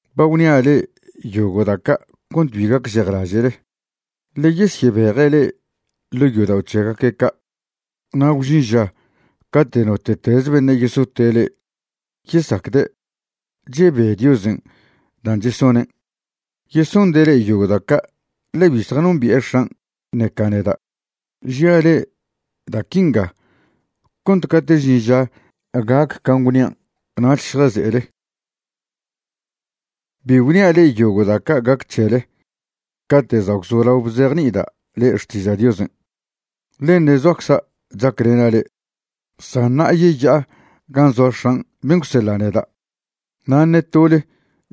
’Ba gwnia' le'e yogo' da' ca' cont bi gacžejlaže'le. Ḻe yesyebeje' le'e ḻo' yodao' c̱hegaque' ca', na' gwžin ža cate' note'tez beṉe' yesote' le'e yesacde' chebe Diosen' dan' chesonen'. Yesonde' le'e yogo' da' ca' ḻe bi zjanombi'e X̱an' ṉeca neda'. Žia le'e da' quinga cont cate' žin ža gac can' gwnian' nach šjaze'ele. ’Bi gwnia' le'e yogo' da' ca' gac c̱hele cate' za' gwzolao bzejni'ida' le'e xtiža' Diosen', ḻe ṉe' zoacza' chaclena' le'e. San ṉa'a yeya'a gan' zoa X̱an' ben' gwseḻa' neda', na' ṉe tole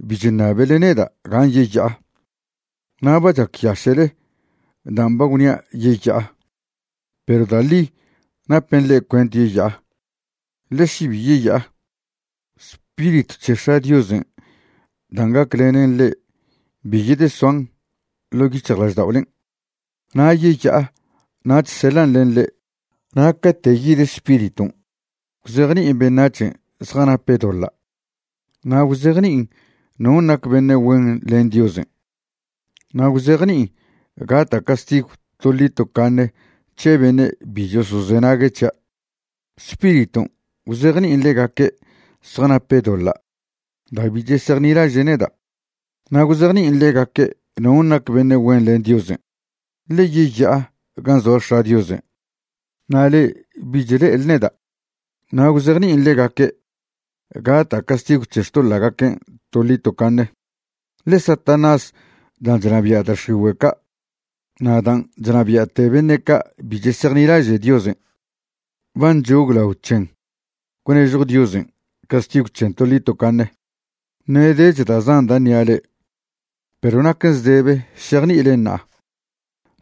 bi chṉabele neda' gan' yeya'a. Na' ba chacyaše'le dan' ba gwnia' yeya'a. Perw da' ḻi napen le'e cuent yeya'a, ḻe še bi yeya'a, Spiritw c̱he X̱a' Diosen' dan' gaclenen le'e bi yedesoan ḻo' yic̱hjlažda'olen'. Na' yeya'a nach seḻan' len le'e. Na' cate' yid Spiriton' gwzejni'in beṉac̱hen' zjanape' doḻa', na' gwzejni'in non' nac beṉe' güen len Diosen', na' gwzejni'in gata' castigw toḻi tocaṉe c̱he beṉe' bi chosozenague' c̱hia'. Spiriton' gwzejni'in ḻegaque' zjanape' doḻa' da' bi chesejnilaže' neda'. Na' gwzejni'in ḻegaque' non' nac beṉe' güen len Diosen', ḻe yeya'a gan' zoa X̱a' Diosen' na' le'e bich le'ele neda'. Na' gwzejni'in ḻegaque' gata' castigw c̱he xtoḻa'gaquen' toḻi tocaṉe, ḻe Satanás dan' chnabia' da' x̱igüe' ca' na' dan' chnabia'te beṉe' ca' bi chesejnilaže' Diosen' ba nchoglaon c̱hen gwnežjw Diosen' castigw c̱hen toḻi tocaṉe. ’Ṉe' dech da' zan da' ṉia' le'e, perw naquen zdebe šejni'ilen ṉa'a.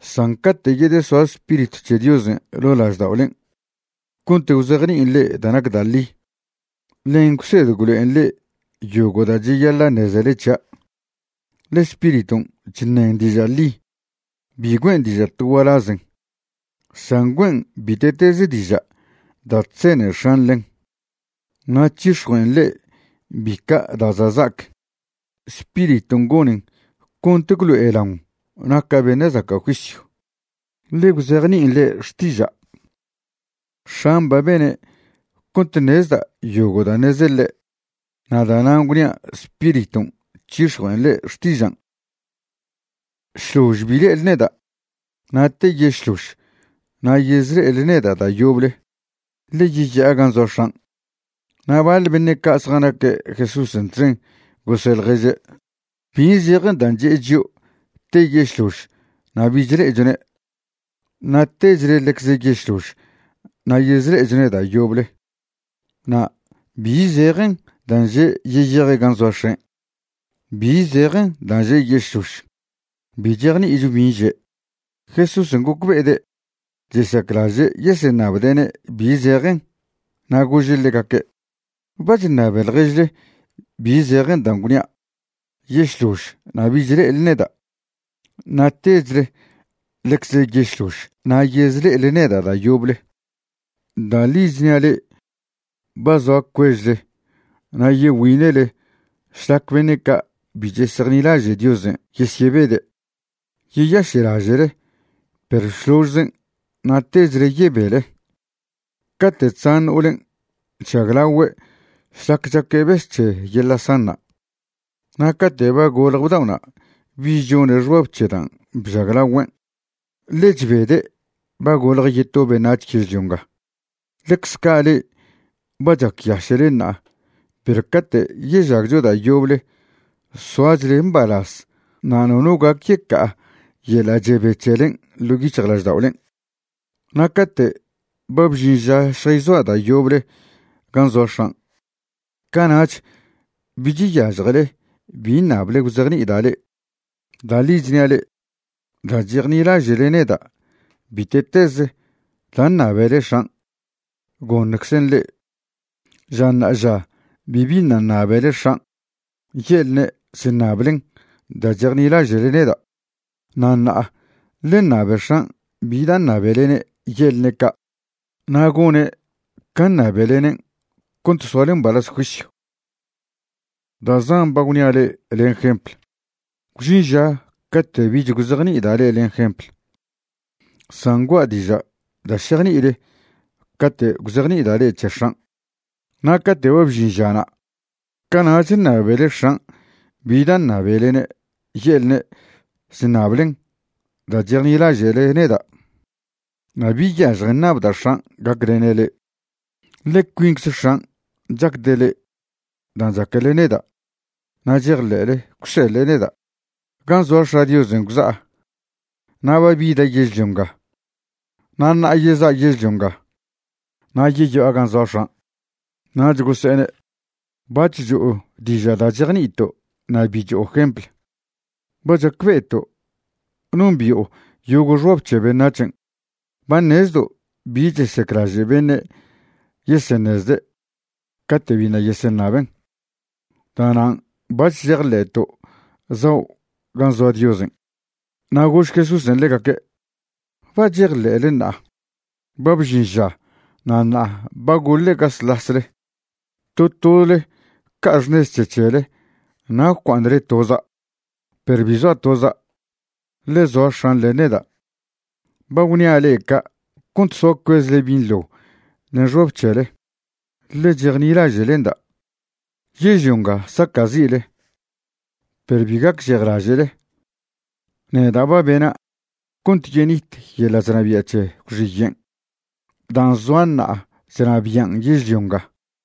San cate' yedesoa Spiritw c̱he Diosen' ḻo' lažda'olen' cont gwzejni'in le'e da' nac da' ḻi, ḻen gwsed gwlo'en le'e yogo' da' cheyaḻa' ṉezele c̱hia', ḻe Spiriton' chṉen diža' ḻi. Bi güe'en diža' to gualazen, san güe'en bite'tez diža' da' chzene X̱an' ḻen, na' c̱hix̱jue'en le'e bica' da' za' za'ac. Spiriton' gonen cont gwlo'elaon naca' beṉe' zaca' juisyw, ḻe gwzejni'in le'e xtiža'. X̱an' ba bene' cont ṉezda' yogo' da' ṉeze ḻe', na' da'nan' gwnia' Spiriton' c̱hix̱jue'en le'e xtižan'. ’Šlož bi le'ele neda', na' te yešlož na' yezle'ele neda' da' yoble, ḻe yeya'a gan' zoa X̱an'. Na' baḻe beṉe' ca' zjanaque' Jesúsen' txen gose' ḻježe': ―¿Bi zejen dan' che'e chio' te yešlož na' bich le'echone' na' techle ḻecze yešlož na' yezle'echone' da' yoble? Na' ¿bi zejen dan' že' yeyeje' gan' zoa X̱en'? ¿Bi zejen dan' že' yešlož? Bi chejni'icho bin' že'. Jesúsen' gocbe'ede' chesaclaže' yeseṉabde'ne' bi zejen, na' gože' ḻegaque': ―¿Ba chṉabe ḻježle bi zejen dan' gwnia': “Yešlož na' bich le'ele neda' na' techle ḻecze yešlož na' yezle'ele neda' da' yoble”? Da' ḻi chnia' le'e ba zoa cuežle na' yegüine'le šlac beṉe' ca' bi chesejnilaže' Diosen' yesyebede'. Yeyaše'laže'le, perw šložzen' na' techle yebele. Cate' chzan no'olen' chžaglagüe' šlac chaque' bes c̱he yeḻa' sanṉa'. Na' cate' ba golje bda'ona' bich chone' xbab c̱he dan' bžaglagüen', ḻe chbede' ba golje yeto beṉac̱h yežlio nga. Ḻecze ca' le'e ba chacyaše'le ṉa'a, perw cate' yežagcho da' yoble soachle mbalaz na' nono gac yeca'a yeḻa' chebe c̱helen' ḻo' yic̱hjlažda'olen'. ’Na' cate' ba bžin ža šjayzoa' da' yoble gan' zoa X̱an', cana'ch bich yažjele bi ṉable gwzejni'ida' le'e. Da' ḻi chnia' le'e, da' chejnilaže'le neda' bite'tez da' ṉabele X̱an', goṉczen' le'e. Ža ṉa'aža bibi ṉa' ṉabele X̱an' ye'lne' chṉablen da' chejnilaže'le neda'. Na' ṉa'a ḻe ṉabe X̱an' bi da' ṉabelene' ye'lne' ca', na' gone' can' ṉabelenen' cont soale mbalaz juisyw. ’Da' zan ba gwnia' le'e len jempl. Gwžin ža cate' bich gwzejni'ida' le'e len jempl, san gua'a diža' da' šejni'ile cate' gwzejni'ida' le'e c̱he X̱an'. Na' cate' ba bžin žana', cana'ch ṉabele X̱an' bi da' ṉabelene' ye'lne' chṉablen da' chejnilaže'le neda'. Na' bi yažjen ṉabda' X̱an' gaclene' le'e. Ḻe cuincze X̱an' chacde' le'e dan' chaquele neda' na' chejḻe'le gwseḻe' neda'. Gan' zoa X̱a' Diosen' gwza'a na' ba bida' yežlio nga. Na' ṉa'a yeza' yežlio nga na' yeya'a gan' zoa X̱an'. Nach gose'ene': ―Bac̱h cho'o diža' da' chejni'ito' na' bi cho'o jemplw. Ba chacbe'eto' nombi'o yogo' xbab c̱he beṉac̱hen'. Ba ṉezledo' bi chesaclaže' beṉe' yeseṉezde' cate' biṉa' yeseṉaben'. Da'nan' bac̱h chejḻe'to' zao' gan' zoa Diosen'. Na' gož Jesúsen' ḻegaque': ―¿Ba chejḻe'le ṉa'a? Ba bžin ža na' ṉa'a ba goḻe' gaslasle. To tole ca'a xṉez c̱he c̱hele na' gwcua'aṉle toza'. Perw bi zoa' toza', ḻe zoa X̱an' len neda'. Ba gwnia' le'e ca' cont soa cuezle binḻo len xbab c̱hele, ḻe chejnilaže'lenda'. Yežlio nga saca'zi'le, perw bi gacžejlaže'le, neda' ba bena' cont yenit yeḻa' chnabia' c̱he gwxiyen' dan' zoa ṉa'a chnabian' yežlio nga.